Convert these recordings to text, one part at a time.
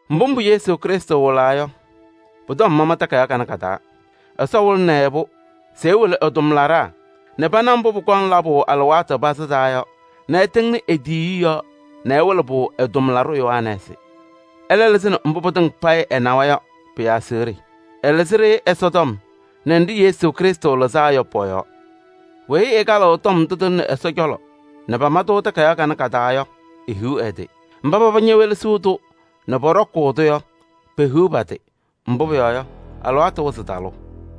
Mbʋ mbʋ Yesu Krɩstʋ wɩlaa yɔ, pʋ-tɔm pama takayaɣ kanɛ ka-taa. Ɛsɔ wɩlɩnɩ-ɩ-pʋ se ɛwɩlɩ ɛ-tʋmlaɖaa nɛ pana mbʋ pʋkɔŋ labʋ alɩwaatʋ pazɩ taa yɔ nɛ ɛtɩŋnɩ e-tiyiyu yɔɔ nɛ ɛwɩlɩ-pʋ ɛ-tʋmlaɖʋ Yohanɛɛsɩ. Ɛlɛ lɩzɩnɩ mbʋ pɩtɩŋa payɩ ɛnawa yɔ pɩ-aseɣɖe: ɛlɩzɩ-ɖɩ Ɛsɔtɔm nɛ nɖɩ Yesu Krɩstʋ ñalɩzaa yɔ pɔ-yɔɔ. Weyi ɛkalɩɣ tɔm ndʋ tɩlɩnɩ Ɛsɔ cɔlɔ nɛ pama takayaɣ kanɛ ka-taa yɔ, ehiɣ ɛ-tɩ! Mba paba ñewelesiɣ-tʋ nɛ pɔɖɔkʋʋ-tʋ yɔ, pehiɣ pa-tɩ! Mbʋ pʋyɔɔ yɔ, alɩwaatʋ wɩzɩ talʋʋ.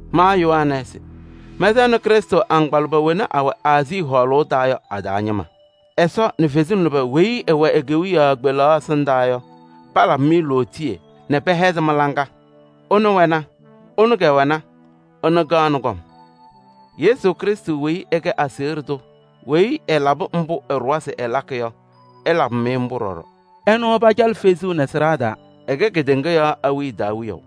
Ma Yohanɛɛsɩ, mɛnsɛɣnɩ Krɩstʋ agbaa lʋbɛ wena awɛ Aazii hɔɔlʋʋ taa yɔ a-taa ñɩma: Ɛsɔ nɛ kalɩzasɩ lʋbɛ nzɩ sɩwɛ e-kewiyaɣ kpelaɣ ɛsɩndaa yɔ, palabɩ-mɩ lootiye nɛ pɛhɛzɩ mɩ-laŋa. Ɛnʋ wɛna, ɛnʋ kɛwɛna, ɛnʋ kaɣnɩ kɔm. Yesu Krɩstʋ weyi ɛkɛ aseɣɖe tʋ weyi ɛlakɩ mbʋ ɛɖʋwa se ɛlakɩ yɔ, ɛlabɩ-mɩ mbʋ ɖɔɖɔ. Ɛnʋ pacalɩ fezuu nɛ sɩɖaa taa, ɛkɛ kedeŋa yɔɔ awiya taa Wiyaʋ.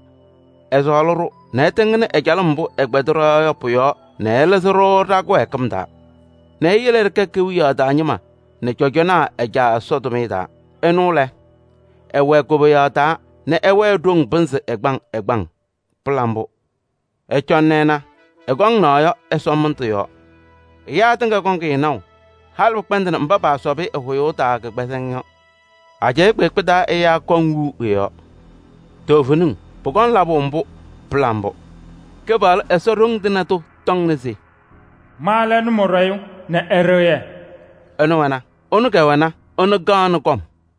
Ɛsɔɔlɩ-ɖʋ nɛ ɛtɩŋnɩ ɛ-calɩm mbʋ ɛkpɛdɩ ɖɔ-yɔɔ yɔ pʋ-yɔɔ nɛ ɛlɩzɩ-ɖʋ ɖa-kɩwɛɛkɩm taa nɛ eyele ɖɩkɛ kewiyaɣ taa ñɩma nɛ cɔjɔnaa ɛ-Caa Ɛsɔ tʋmɩyɛ taa. Ɛnʋ lɛ, ɛwɛɛ koboyaɣ taa nɛ ɛwɛɛ ɖoŋ pɩnzɩ ɛgbaŋ ɛgbaŋ! Pɩla mbʋ! Ɩcɔnɩ ɩna, ɛkɔŋ naɣ yɔ ɛsɔmɩndʋ yɔɔ! Ɛyaa tɩŋa kɔŋ-ɩ naʋ, halɩ pɩkpɛndɩnɩ mba paasɔbɩ ɛ-hʋyʋʋ taa kɩkpɛzɩŋ yɔ. Ajɛɛ kpeekpe taa ɛyaa kɔŋ wiu ɛ-yɔɔ. Toovenim, pʋkɔŋ labʋ mbʋ! Pɩla mbʋ! Kɩpaɣlʋ Ɛsɔ Ɖoŋ Tɩŋa Tʋ tɔŋna se: “Ma lɛ Nʋmɔɖɛyʋ nɛ Ɛɖɩɣyɛ.” Ɛnʋ wɛna, ɛnʋ kɛwɛna, ɛnʋ kaɣnɩ kɔm.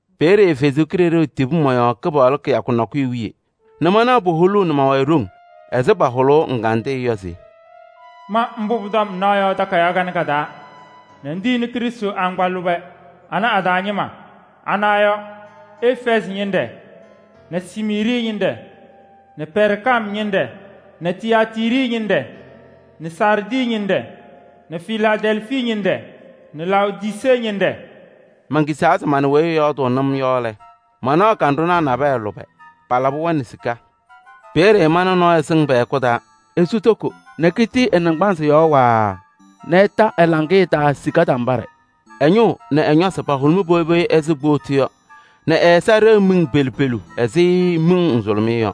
Peeye Ɛsɔ Kalɩzaɣ tibi mɔ-yɔɔ Kɩpaɣlʋ kɩyakʋ nakʋyʋ wiye nɛ manɩɣ puholuu nɛ ma-wayɩ ɖoŋ ɛzɩ pahʋlʋʋ ɛgandɩyɛ yɔ se: “Ma mbʋ ŋnaɣ yɔ pʋ-tɔm takayaɣ nakɛyɛ taa nɛ ŋtiyini Krɩstʋ agbaa lʋbɛ anɛ a-taa ñɩma. Ana yɔ: Efɛɛzɩ ñɩnɖɛ nɛ Smiirnɩ ñɩnɖɛ nɛ Pɛɛrgam ñɩnɖɛ nɛ Tiyaatiiri ñɩnɖɛ nɛ Saardɩ ñɩnɖɛ nɛ Filaadɛlfii ñɩnɖɛ nɛ Laodisee ñɩnɖɛ.” Menkisaa se mana weyi ɛyɔɔdʋʋnɩ-m yɔ lɛ, manaɣ kanɖʋnaa nabɛyɛ lʋbɛ, palabɩ-wɛ nɛ sika. Peeye mana nɔɔyʋ sɩŋ pɛ-hɛkʋ taa. Esu toko nɛ kitii ɛ-naŋgbanzɩ yɔɔ waaa nɛ ɛta ɛ-laŋɩyɛ taa sika tambaɖɛ. Ɛ-ñʋʋ nɛ ɛ-ñɔsɩ pahʋlʋmɩ poyi poyi ɛzɩ kpootu yɔ nɛ ɛ-ɛza ɖeɣ miŋ pelu pelu ɛzɩ miŋ nzʋlʋmɩyɛ yɔ.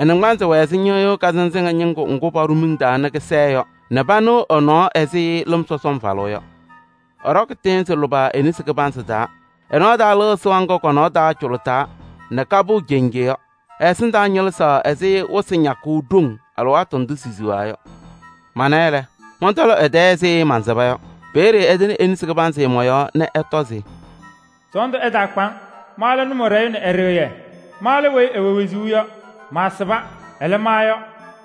Ɛ-naŋgbanzɩ wɛ ɛzɩ ñɩɣyʋʋ kazɩnzɩŋa ñɩŋgʋ ŋgʋ paɖʋ miŋ taa nɛ kɩsɛɛ yɔ nɛ panɩɣ ɛ-nɔɔ ɛzɩ lɩm sɔsɔm falʋʋ yɔ. Ɛɖɔkɩ tɩɩnzɩ lʋbɛ e-nesi kɩbanzɩ taa nɛ ɛ-nɔɔ taa lɩɣ sɩɣa ŋga kɔ-nɔɔ taa cʋlʋtaa nɛ kapɩɣ cenje yɔ. Ɛ-ɛsɩndaa ñɩlɩzaɣ ɛzɩ wɩsɩ ñakʋʋ ɖoŋ alɩwaatʋ ndʋ sisiɣa yɔ. Mana-ɩ lɛ, mɔntɔlɩ ɛ-tɛɛ ɛzɩ mansɩba yɔ. Peeye ɛtɩnɩ e-nesi kɩbanzɩ mɔ-yɔɔ nɛ ɛtɔ se: “Sɔɔndʋ ɛtaakpa-ŋ! Ma lɛ Nʋmɔɖɛyʋ nɛ Ɛɖɩɣyɛ. Ma lɛ weyi ɛwɛ wezuu yɔ. Maasɩba, ɛlɛ, ma yɔ,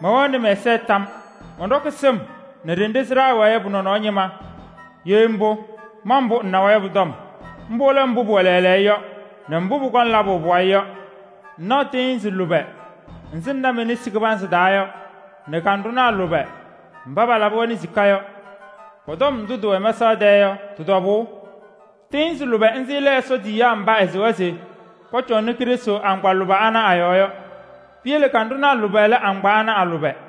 mɛwɛɣnɩ mɛ-ɛza tam yɔɔ. Mɔnɖɔkɩ sɩm nɛ ɖenɖe sɩɖaa wɛɛ yɔ pɔ-nɔnɔɔ ñɩma. Ye mbʋ, ma mbʋ ŋnawa yɔ pʋ-tɔm. Mbʋ lɛ mbʋ pʋwɛ lɛɛlɛɛyɔ yɔ nɛ mbʋ pʋkɔŋ labʋ pʋwayɩ yɔ. Ŋnaɣ tɩɩnzɩ lʋbɛ nzɩ ŋna me-nesi kɩbanzɩ taa yɔ nɛ kanɖʋnaa lʋbɛ mba palabɩ-wɛ nɛ sika yɔ, pɔ-tɔm ndʋ tɩwɛ mɛsaɣ tɛɛ yɔ tɩ-tɔbʋʋ: tɩɩnzɩ lʋbɛ nzɩ lɛ Ɛsɔ tiyiyaa mba ɛsɩwa se pɔcɔnɩ Krɩstʋ agbaa lʋbɛ ana a-yɔɔ yɔ. Piyele kanɖʋnaa lʋbɛ lɛ agbaa ana a-lʋbɛ.”